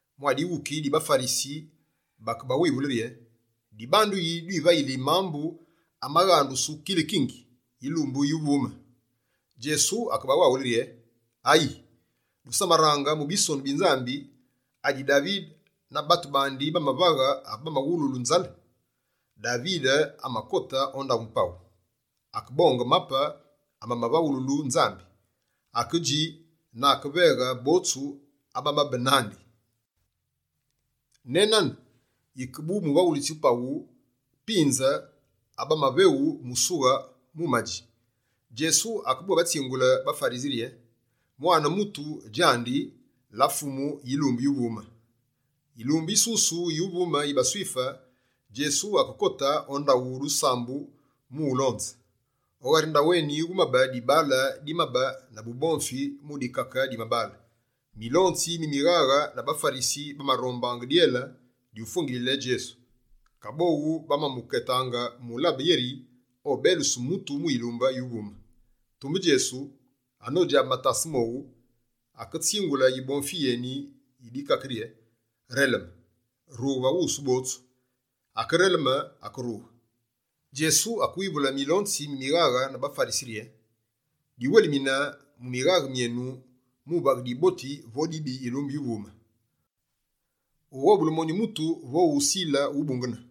Mwa dighuki di baFarisi bakebawivule rye: «Dibandu yi dwivayili mambu amaghandusu “kilikingi” yilumbu yuvume?» Djesu akebawaghule rye: «Ayi, dusamaraange mu bisonu bi Nzambi, adi Davide na batu bandi bamavaghe ave bamawululu nzale? Davide amakote o ndaghu paghu, akebonge mape amavaghululu Nzambi. Akedji na akemaveghe botsu abamabe nandi. Nenane, yike bu bavaghulitsi ba paghu pinze abamaveghu musughe mu umadji.» Djesu akebwétsingule baFarisi rye: «Mwane Mutu djandi, la Fumu yilumbu yuvume.» Yilumbu yisusu yuvume yi baSwife, Djesu akekote o ndaghu dusambu mu ulonze. O ghari ndaghu eni, wumabe dibaale dimabe na bubomfi mu dikake di mabaale. Milonzi mi mighaghe na baFarisi bamarombaange dyele dyufwengilile Djesu. Kaboghu bamamuketanga mu ulabe yeri obeluse mutu mu yilumbu yuvume. Tumbe Djesu, anodjabe matase mowu, aketsingule yibomfi yeni yi dikake rye: «Releme, rughe va wusu botsu!» Akereleme, akerughe. Djesu, akewivule milonzi mi mighaghe na baFarisi yeri: «Diwelimine mu mighaghe myenu mu vaghe diboti vo dibi yilumbu yuvume, wughobule monyu mutu vo ughusile wubungene?»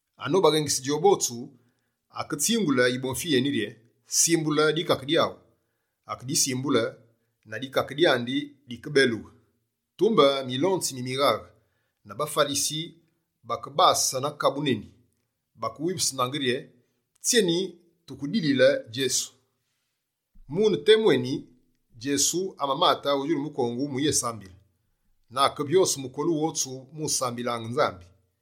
Anobaghengise djowu botsu, aketsingule yibomfi yeni rye: «Simbule dikake dyaghu.» Akedisimbule, na dikake dyandi dikebelughe. Tumbe, milonzi mi mighaghe na baFarisi bakebase na kabu neni, bakewivusunaange rye: «Tsyeni tukedilile Djesu?» Mune temu eni, Djesu amamate o djulu mukongu mu uyésambile. Na akevyose mukolu wotsu mu usambilaange Nzambi.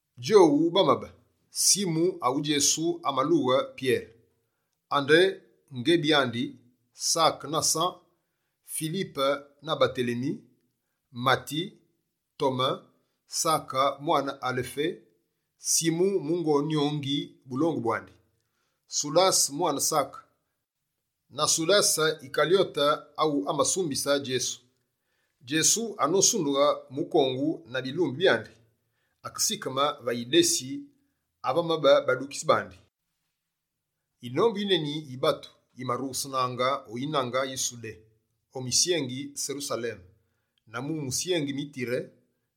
Djowu bamabe: Simu awu Djesu amalughe Pyere, Andere ngebi andi, Sake na San, Filipe na Batelemi, Mati, Tome, Sake mwane Alefé, Simu mungo nyongi bulongu bwandi, Sudase mwane Sake na Sudase Yikalyote awu amasumbise Djesu. Djesu, anosundughe mukongu na bilumbi byandi, akesikeme va idesi ave vamabe badukitsi bandi. Yinombu yineni yi batu yimarughesenaange o yinange yi Sudé, o musyengi Serusaleme, na mu misyengi mi Tire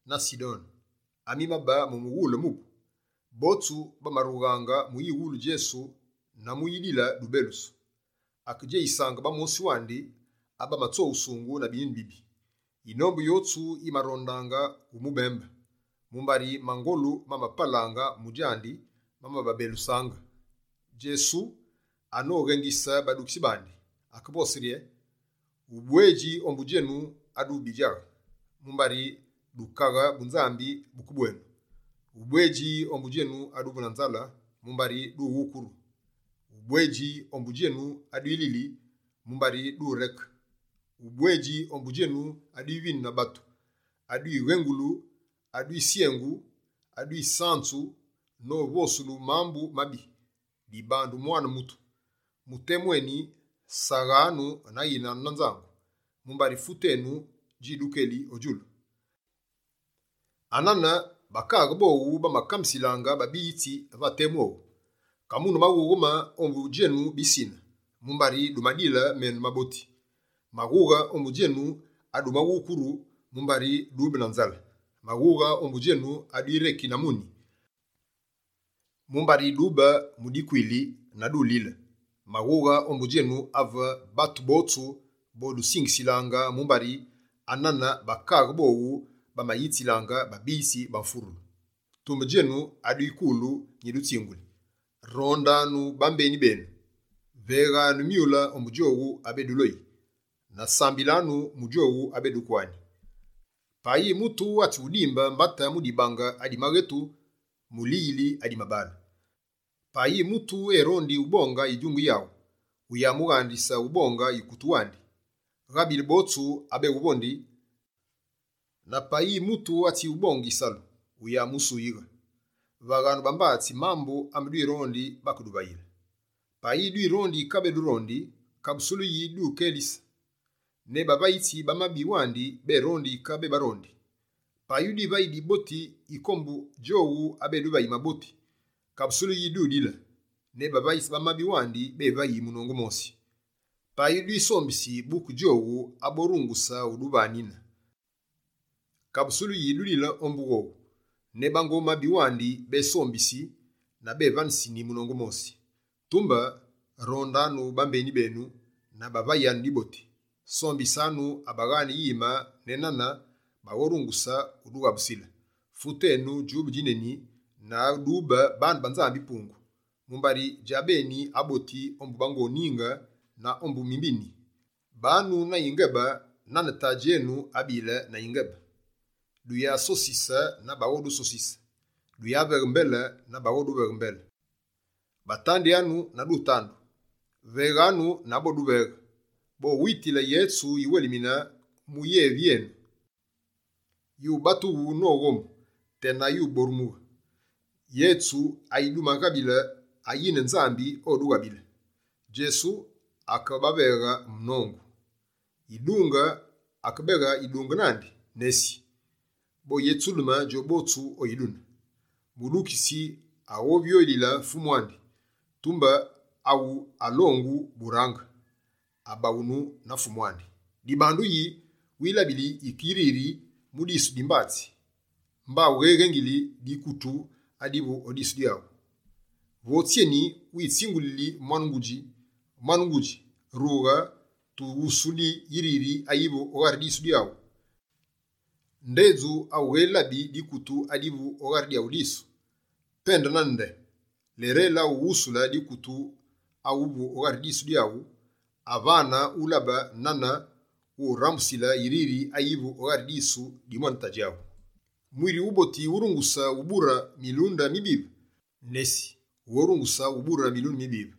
na Sidone amimabe mu mughule mubu. Botsu, bamarughaange mu uyiwulu Djesu na mu uyidile dubelusu. Akedjeyisaange bamosi wandi abamatsoghusungu na binyuni bibive. Yinombu yotsu yimarondaange umubembe, mumbari mangolu mamapalaange mu djandi mamababelusaange. Djesu, anoghengise badukitsi bandi, akevose rye: «Ubwedji ombu djenu aduvu bidjaghe, mumbari Bukaghe bu Nzambi buke bwenu. Ubwedji ombu djenu aduvu na nzale, mumbari dughukuru. Ubwedji ombu djenu abedwilili, mumbari dureke. Ubwedji ombu djenu abedwivinu na batu, abedwiwengulu, abedwisyengu, abedwisanzu novosulu mambu mabi, dibandu Mwane Mutu. Mu temu eni, saghanu na yinanu na nzangu, mumbari fute neni djidukelisi o djulu. Anane bakaaghe bowu bamakambisilaange babiyitsi va temu owu. Kamune maghughe ma ombu djenu bisine, mumbari dumadile menu maboti. Maghughe ombu djenu adumaghukuru, mumbari dube na nzale. Maghughe ombu djenu adwireki na muni, mumbari dube mu dikwili na dulile! Maghughe ombu djenu ave batu botsu bodusingisilaange, mumbari anane bakaaghe bowu bamayitsilaange babiyitsi ba mfurulu!» «Tumbe djenu adwikulu nyidutsinguli: Rondanu bambeni benu. Veghanu myule ombu djowu abeduloyi; na sambilanu mu djowu abedukwani. Payi mutu atsighudimbe mbate mu dibange adi maghetu, muliyili adi mabaale. Payi mutu erondi ubonge yidjungi yaghu, wuyamughandise ubonge yikutu wandi. Ghabile botsu abeghuvondi, na payi mutu atsiwubonge yisalu, wuyamusuyighe. Vaghanu bambatsi mambu ame dwirondi bakeduvayile. Payi dwirondi yike abedurondi, kabusulu yi dwikelisi? Ne bavayitsi ba mabi wandi berondi yike abebarondi. Payi dwivayi diboti yike ombu djowu abeduvayi maboti, kabusulu yi dudile? Ne bavayitsi ba mabi wandi bevayi munongu mosi. Payi dwisombisi buke djowu aborunguse uduvanine, kabusulu yi dudile ombu owu? Ne bango mabi wandi besombisini, na bevaneseni munongu mosi. Tumbe, rondanu bambeni benu na bavayanu diboti, sombisanu abaghaane yime nenane baghorunguse wudughabusile. Fute enu djube djineni na dube baane ba Nzambi-Pungu, mumbari djabeni aboti ombu bango ninge na ombu mimbini. Banu na yingebe, nane Tadji enu abile na yingebe.» «Duyasosise na baghodusosise; duyaveghe mbele, na baghoduveghe mbele. Batandyanu, na dutandu. Veghanu na boduveghe: bowitile yetsu yiwelimine mu yevi yenu. Yubatughu noghomu tena yuborumughe. Yetsu ayidumaghabile ayine Nzambi odughabile.» Djesu akebaveghe nongu: «Yidunge akebeghe yidunge nandi? Nesi, boyetsudeme djowu botsu o yidune! Mudukitsi aghovyoghulile Fumu andi, tumbe awu alongu burange, obaghunu na Fumu andi. Dibandu yi wilabili yike yiriri mu disu di mbatsi aghu, mba wughélabi dikutu adivu o dyaghu disu? Vo tsyeni wutsingulile mwane ngudji: “Mwane ngudji, rughe tuwusuli yiriri ayivu o ghari disu dyaghu”, ndedju awughélabi dikutu adivu o ghari dyaghu disu? Pende nane nde, lérele ughusule dikutu adivu o ghari disu dyaghu, avane ulabe nane wurambusile yiriri ayivu o ghari disu di mwane ngudji.» «Mwiri wuboti wurunguse ubure milunde mibive? Nesi, wughorunguse ubure milunde mibive.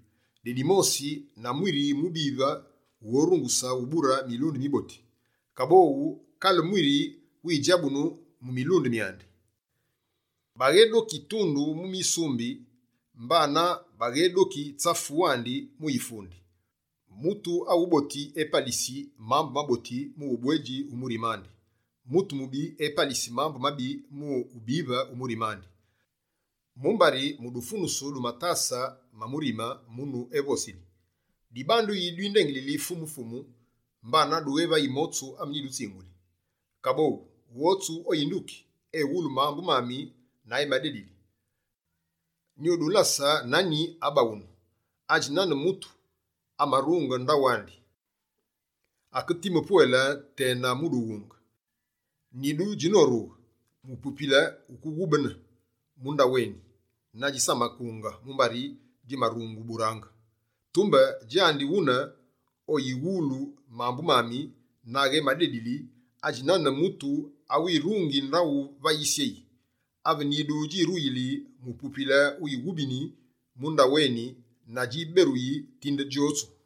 Dedi mosi na mwiri wubive wughorunguse ubure milunde miboti. Kaboghu, kale mwiri widjabunu mu milunde myandi. Baghédoki tundu mu misumbi, mbanane baghédoki, tsafu wandi mu yifundi. Mutu awuboti, epalisi mambu maboti mu ubwedji wu murimandi. Mutu mubi, epalisi mambu mabi mu wubive wu murime andi. Mumbari mu dufunusu du matase ma murime, munu evosili.» «Dibandu yi dwindengilili “Fumu, Fumu!” Mbana dughevayi motsu ame nyidutsinguli? Kaboghu, wotsu oyinduki, ewulu mambu mami na emadedili, nyudulase nani abaghunu. Adji nane mutu, amarunge ndaghu andi, aketime pwele ne mu dughunge. Nidu djinorughe, mupupile wukeghubene mu ndaghu eni, na djisamakunge mumbari djimarungu burange. Tumbe, djandi wune oyiwulu mambu mami na aghemadedili, adji nane mutu awirungi ndaghu va yisyeyi. Ave nyidu djiruyili, mupupile wighubeni mu ndaghu eni na djiberuyi tinde djotsu.»